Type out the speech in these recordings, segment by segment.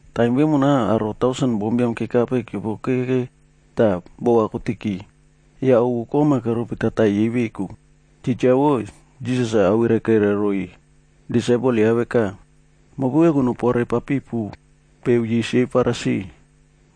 Taim vemona aro tausen bombiam kekape keopokeke tah bova kotiki, yah ovu kom-a keropi tataiy yei veku. Titja wo, Jisas-a ava kairai roiy disaipel ya veka, “Mopu veku nopore papipu peo yis yei Farisi.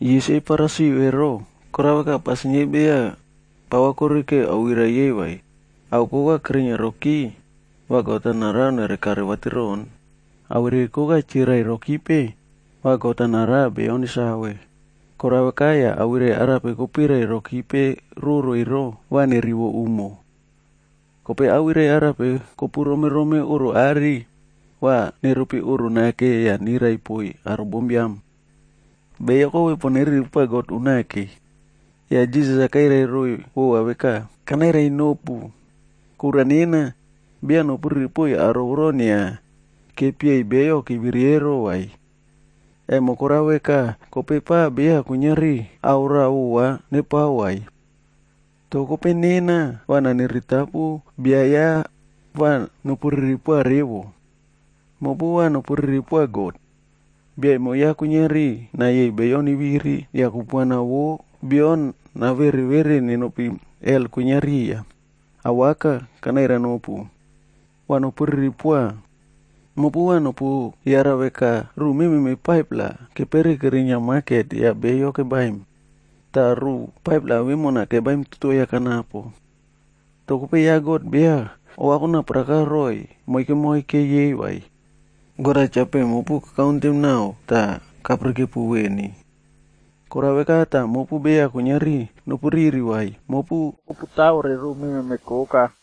Yis yei Farisi ero, korao veka, pasin yei beya pava korikeu awirai yei vai. Ao koka kerinia roki, va God-a narao nere kare vatiron. Awirai koka chirirai rokipe, va God-a narao beyo nesave. Korao veka yah awirai arape kopirai rokipe roro ero, va nerivo umo. Kope awirai arape kopu romerome oꞌro are, va neropi oꞌro nake yah nirai poiy aro bombiam.”Beyo kope pon neriri poa God unake Yah Jisas-a kairai roiy vova veka, “Kanairai nopu, kura nena, beya nopuriri poiy aro voro inia kepieiy beyo keviri eroa vai. Emo korao veka kope pa beya kuiniari ao raꞌa vova nepao vai. Toh kope nena, va naniritapu bia ya va nopuriri poa revo. Mopu va nopuriri poa God, bia emo ya kuiniari nayeiy beyo neviri, yah kupuana vo bio navere vere nenopi Hel kwinia riya. Awaka! Kanairai nopu, va nopuriri poa. Mopu va nopu yara veka, ruꞌu mememe 5-pla, kepere kerinia maket yah beyo kebaim, tah ruꞌu 5-pla vemona baim 2-toea kanapo. Toh kope ya God-a beya ova konaparaka roiy moike moike yei vai. God-a cha peꞌe mopu kakauntem nao tah kapirikepu veni. Korao veka tah mopu beya kuiniari nopuriri vai, mopu koputawore ruꞌu mememe koka.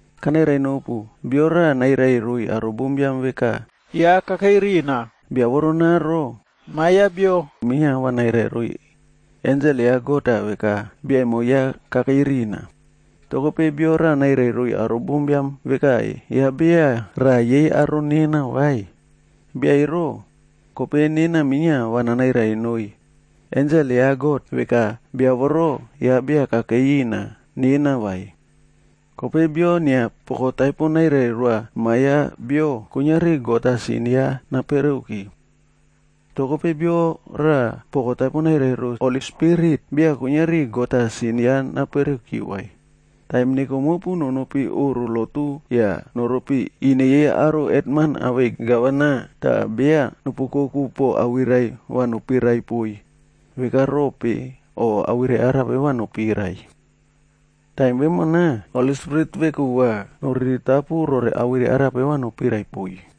“Kanairai nopu, bia raꞌa nairai roiy aro bombiam veka ya kakei rina, bia voronaro, Ma Biam ya Bio minia va nairai roiy ensel ya God-a veka bia emo kakei rina. Toh kope bio nairai roiy aro bombiam veka ya beya raꞌa yei aro nena vai, bia ero, kope nena minia va nanairai noiy ensel ya God-a veka bia voro, beya kakei rina nena vai. Kope bio inia poko taipo nairai roa Ma Biam ya Bio, kuiniari God-a sin ya napereuki. Toh kope bio raꞌa poko taipo nairai ro Holi Spirit, beya kuiniari God-a sin ya napereki vai. “Taim neko mopu nokope oꞌro lotu yah noropi ine yei aro hetman awei gavana tah beya nopu oukoku po awirai va nopirai poiy veka rope o awirai arape va nopirai. Taim vemona Holi Spirit veku va noriritapu rore awirai arape va nopirai poiy.”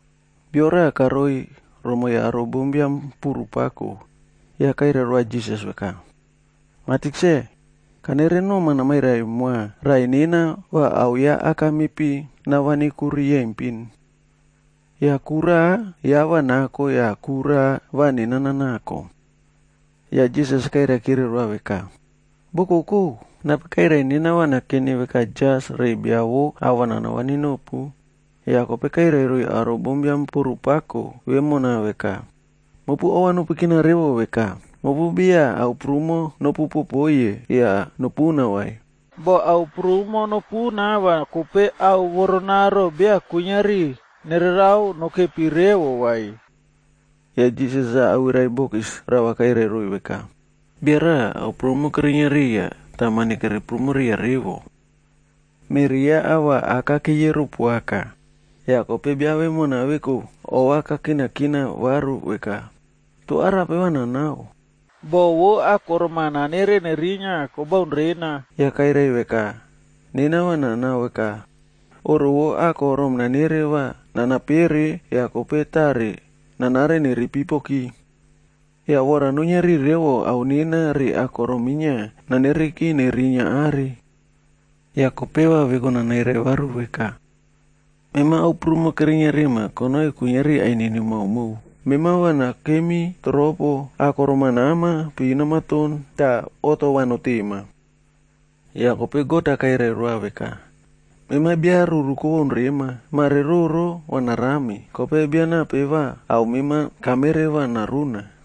Bia raꞌa karoi romoiy aro bombiam puru pako yah kairai roa Jisas-a veka, “Mah Tikse, kanere noma namairai moa raꞌai nena va ao ya aka mepi navani ku riyempin. Yah ku raꞌa ya va nako yah ku raꞌa va nena nanako.” Yah Jisas kairaikire roa veka, “Bokokou! Nape kairai nena va nakeni veka jas re bia vo ava nana vani nopu?” Yah kope kairai roiy aro bombiam puru pako vemona veka, “Mopu ova nopukina revo ke! Mopu beya ao prumo nopu popoiye yah nopuna vai. Boh ao prumo namuna va kope ao voronaro beya kuiniari nererao nokepi revo vai.” Yah Jisas awirai bokis rava kairai roiy veka, “Bia raꞌa, ao prumo kerinia riya tah mani kere prumo riya revo. Meꞌri ya ava aka keyero poaka. Yah kope bia vemona veku ova kakinakina varu veka, ‘Toh arape va nanao? Boho vo akorom-a nanere nerinia kobaun rena.’ “Yah kairai veka, ‘Nena va nanao veka, oꞌro vo akorom nanere va nana perepere yah kope tare nanare nere ipipoki. Yah vora nuiniari revo ao nena re akorom minia nanereki nerinia are. Yah kope va veku nanairai varu veka, “Mema ao prumo kerinia rima konoi kuiniari ainini maomao. Mema va nakemi toropo, akorom-a nama, piva namaton tah oꞌto va notema.” ’ “Yah kope God-a kairai roa veka, ‘Mema bia ruru kobaun rema! Mare roro va narami, kope bia nape va ao mema kamere va naruna?’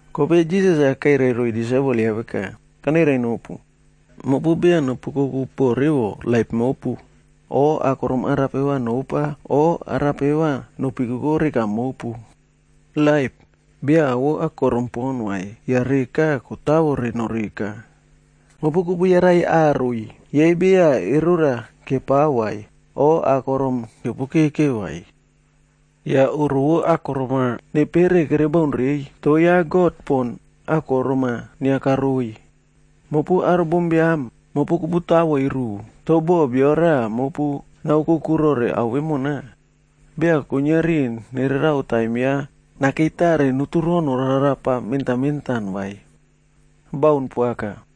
Kope Jisas-a kairai roiy disaipel ya veka, “Kanairai nopu, mopu beya nopu oukoku po revo laip mopu, o akorom arape va nopa o arape va nopikoko reka mopu. Laip, beya ao vo akorom pon vai, yah reka kotavore noreka. Mopu kopu yarai aroi, yei beya erora kepao vai o akorom-a keopokeke vai. Yah oꞌro vo akorom-a nepere kere baun reiy, toh ya God pon akorom-a inia karoiy. Mopu aro bombiam, mopu koputavoi ruꞌu. Toh boh bia raꞌa mopu naoukoku rore ao vemona, beya kuiniari nererao taim ya nakei tare noturo norarapa mentan mentan vai. Baun poaka!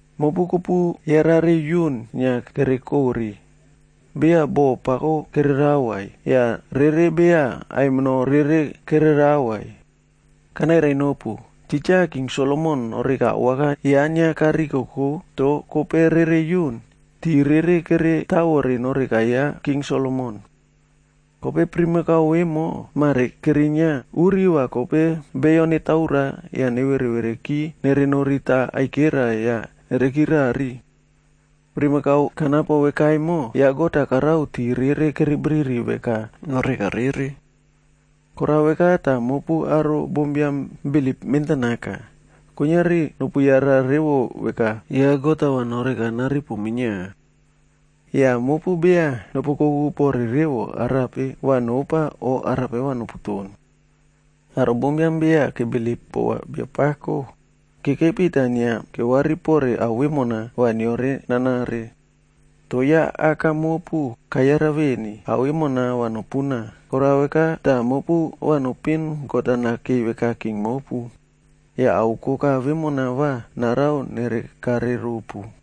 “Mopu kopu yarare yun inia kere kore, beya boꞌo pako kererao vai, yah rere beya aimino rere kererao vai. Kanairai nopu, titja King Solomon noreka awaka ya inia karikoko toh kope rere yun, tii rere kere tawore noreka ya King Solomon. Kope primakau vemo mare kerinia, uri va kope beyo netaura yah nevereki nerenorita aikera yah nerekirari. Primakau kanapo veka emo, ya God-a karao tii kere biriri veka noreka rere. Korao veka tah mopu aro bombiam bilip mentanaka, kuiniari nopu yara revo veka, ya God-a va noreka naripu minia. Yah mopu beya nopu oukoku pore revo arape va nopa o arape va noputon. Aro bombiam beya kebilip pova Biapako, kekepi tah inia kewari pore ao vemona va neore nanare. Toh ya Aka mopu kayara veni, ao vemo va nopuna. Korao veka tah mopu va nopin God-a nakei veka king mopu. Yah ao koka vemona va narao nere kare ropu.”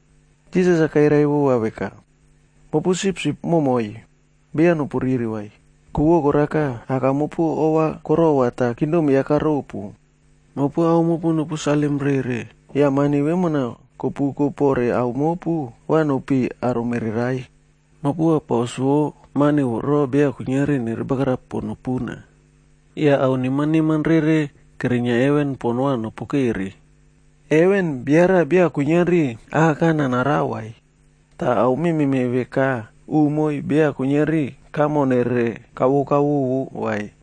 Jisas-a kairai vova veka, “Mopu sipsip moimoi, beya nopu riri vai, ku vo korao veka Aka mopu ova korova tah kingdom ya karopu. Mopu ao mopu nopu salim rere. Yah mani vemona kopuko pore ao mopu, va nopiꞌiy aro mererai. Mopu va paus vo mani voro beya kuiniari nerebagarap pon nopuna. Yah ao neman neman rere kerinia heven pon va nopokere. Heven, bia raꞌa beya kuiniari akakana narao vai, tah ao mememe veka umoi beya kuiniari kamo nere kavo kavovo vai.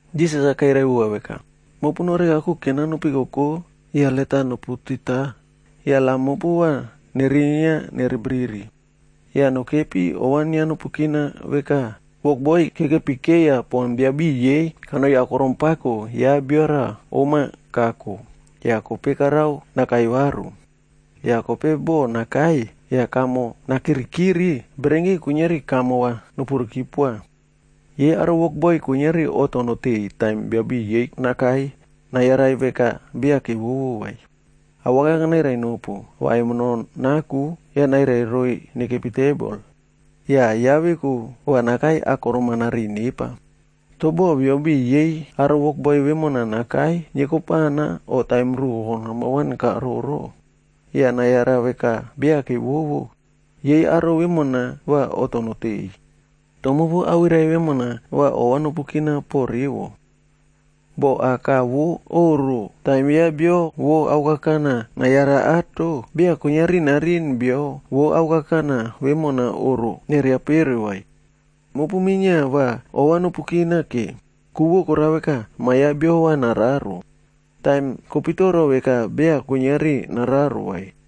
Jisas-a kairai vova veka, “Mopu noreka kuken-a nopikoko yah let-a noputita, yah lam mopu va nerinia nere briri. Yah nokepi ova inia nopukina veka wokboi kekepi keiya pon biabiꞌiy yei kanoi akorom pako ya bia raꞌa om-a kako, yah kope karao nakai varu. Yah kope boh nakai yah kamo nakirikiri, bererenki kuiniari kamo va nepuriki poa. Yei aro wokboi kuiniari oꞌto noteꞌeiy taim biabiꞌiy yei nakai nayarai veka beya kevovo vai. Awaka kanairai nopu, va aimino naku yah nairai roiy nekepi tebol. Yah ya veku va nakai akorom-a nariꞌiy nepa.b Toh boh biabiꞌiy yei aro wokboi vemona nakai niekopana o taim rukoko nambawan kaororo, yah nayara veka beya kevovo, yei aro vemona va oꞌto noteꞌeiy. “Toh mopu va awirai vemona ova nopukina po revo. Boh aka vo oꞌro taim ya bia ao kakana nayara ato, beya kuiniari nariꞌin bia vo ao kakana vemona oꞌro neriapere vai. Mopu minia va ova nopu kina ke, ku vo korao veka, Ma Biam ya Bio va nararo, taim kopitoro veka beya kuiniari nararo vai.”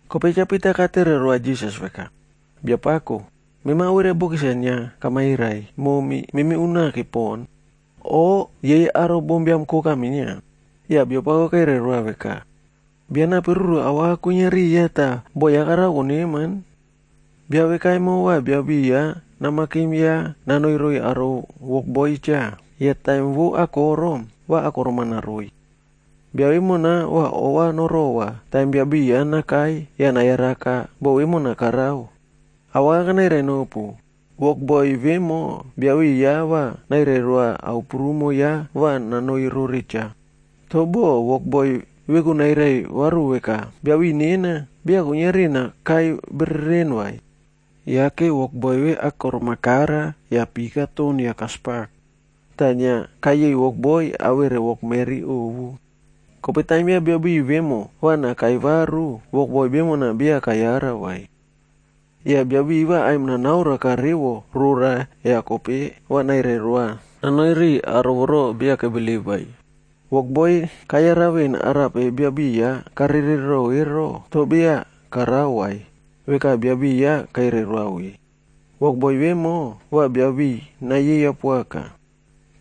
Kope Cha Pita katere roa Jisas-a veka, “Biapako, mema awirai bokis-a inia kamairai momi memi unake pon, o yei aro bombiam koka minia?” Yah Biapako kairai roa veka, “Bia nape ruru awaka kwinia riya tah boꞌo ya narao noneman? Bia veka emo va biabiꞌiy ya namakim ya nanoi roiy aro wokboi-a cha. Yah taim vo akorom, va akorom-a naroiy. Bia vemo va ova norova taim biabiꞌiy ya nakai yah nayaraka boꞌo vemona karao. Awaka kanairai nopu, wokboi vemo biabiꞌiy ya va nairai roa ao prumo ya va nanoi rore cha. Toh boh, wokboi veku nairai varu veka, ‘Biabiꞌiy nena, beya kuiniari nakai bereren vai.’ Yake wokboi ve akorom kara yah pi katon yah kaspak, tah inia kayeiy wokboi awere wokmeri ovu. Kope taim ya biabiꞌiy vemo va nakai varu, wokboi vemona, beya kayara vai. Yah biabiꞌiy va aimon-a naoroaka revo rora yah kope va nairai roa nanoi riꞌiy aro voro beya kebilip ero. “Wokboi kayara veꞌen arape biabiꞌiy ya karerero ero. Toh beya karao vai, veka bia biꞌiy ya kairai roa ve, wokboi vemo va biabiꞌiy nayeiya poaka.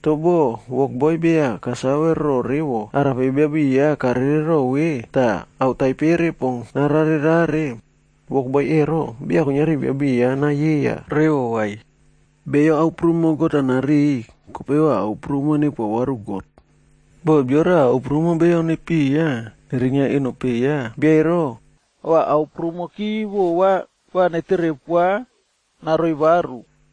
Toh boh wokboi beya kasave ro revo arape biabiꞌiy ya karerero ve tah ao taipere pon narare rare, wokboi ero, beya kuiniari biabiꞌiy ya nayeiya revo vai. Beyo ao prumo God-a nariꞌiy,c kope va ao prumo nepoa varu God. Boh bia raꞌa ao prumo beyo nepiya nerinia eno peꞌe ya, bia ero, va ao prumoki vova va netere poa naroi varu.”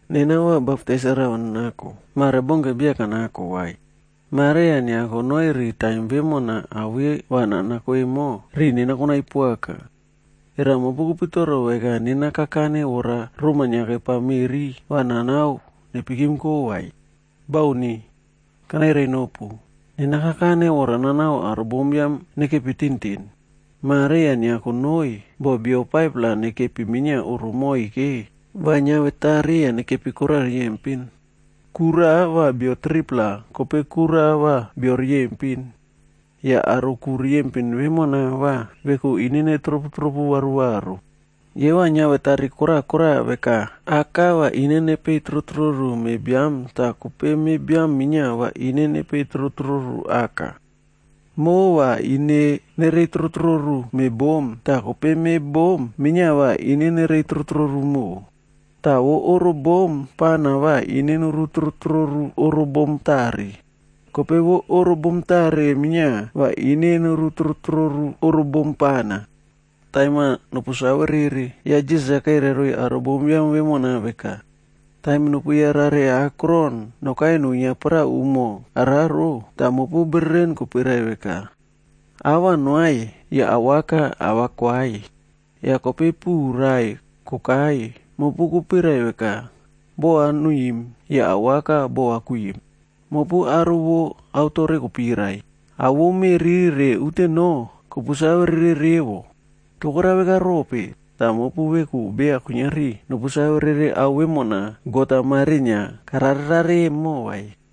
Nena va baptais rava nanako.d Mare, baunke beya kanako vai. Mare yah inia konoi ri taim vemona ao ve va nanako emo, riꞌi nena konai poaka. Era mopu kopitoro veka nena kakane vora roma inia kiopa meꞌri va nanao nepikimko vai? Bauni! Kanairai nopu, nena kakane vora nanao aro bombiam nekepi tintin. Mare yah inia konoi, boh bio 5-pla nekepi minia oꞌro moike va niavetari yah nekepi koraꞌa riyempin. Ku raꞌa va bio 3-pla kope ku raꞌa va beyo riyempin. Yah aro ku riyempin vemona va veku ine nepetropu varuvaru. Yei va niavetari kora kora veka, aka va ine nepei trotroru me biam tah kope me biam minia va ine nepei trotroru aka. Moꞌo va ine nerei trotroru me bom tah kope me bom minia va ine nerei trotroru moꞌo, tah vo oro bom pana va ine noru trotroru oro bom tare, kope vo oro bom tare minia va ine noru trotroru oro bom pana.” Yah Jisas kairai roiy aro bombiam vemona veka, “Taim kopu yarare akron nokai nuinia paraꞌa umo araro, tah mopu bereren kopirai veka, ‘Aꞌ va noaiy,’ yah awaka ava koaiy. Yah kope puꞌu rai kokai, mopu kopirai veka, ‘Boho va nuiꞌim,’ yah awaka bova kwiꞌim. Mopu aro vo aotore kopirai, ao vo meꞌri re unteno, kopu save rere revo. Toh korao veka rope, tah mopu veku beya kuiniari nopu save rere ao vemona God-a mare inia kararerare emo vai?”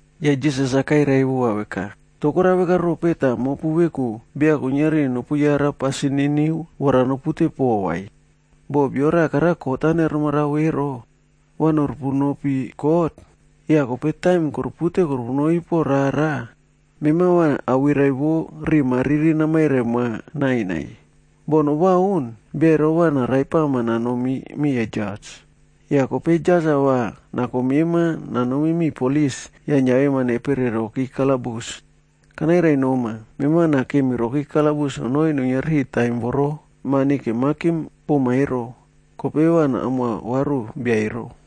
Yah Jisas-a kairai vova veka, “Toh korao veka rope tah mopu veku beya kuiniari nopu yara pasin niniu vora nopute poꞌo vai? Boh bia raꞌa kot-a karao neremarao ero, va noru punopi kot, yah kope taim korupute korupunopi rara, mema va awirai vo riꞌi mariri namairai moa nainai. Boh nobaun, bia ero va naraipama nanomi miya jas. Yah kope jas-a va nako mema nanomi miꞌiy polis yah niavema nepere roki kalabus. Kanairai noma, mema va nakemi roki kalabus nonoi nuiniari taim voro mani kemakim poma ero, kope va namoa varu bia ero.”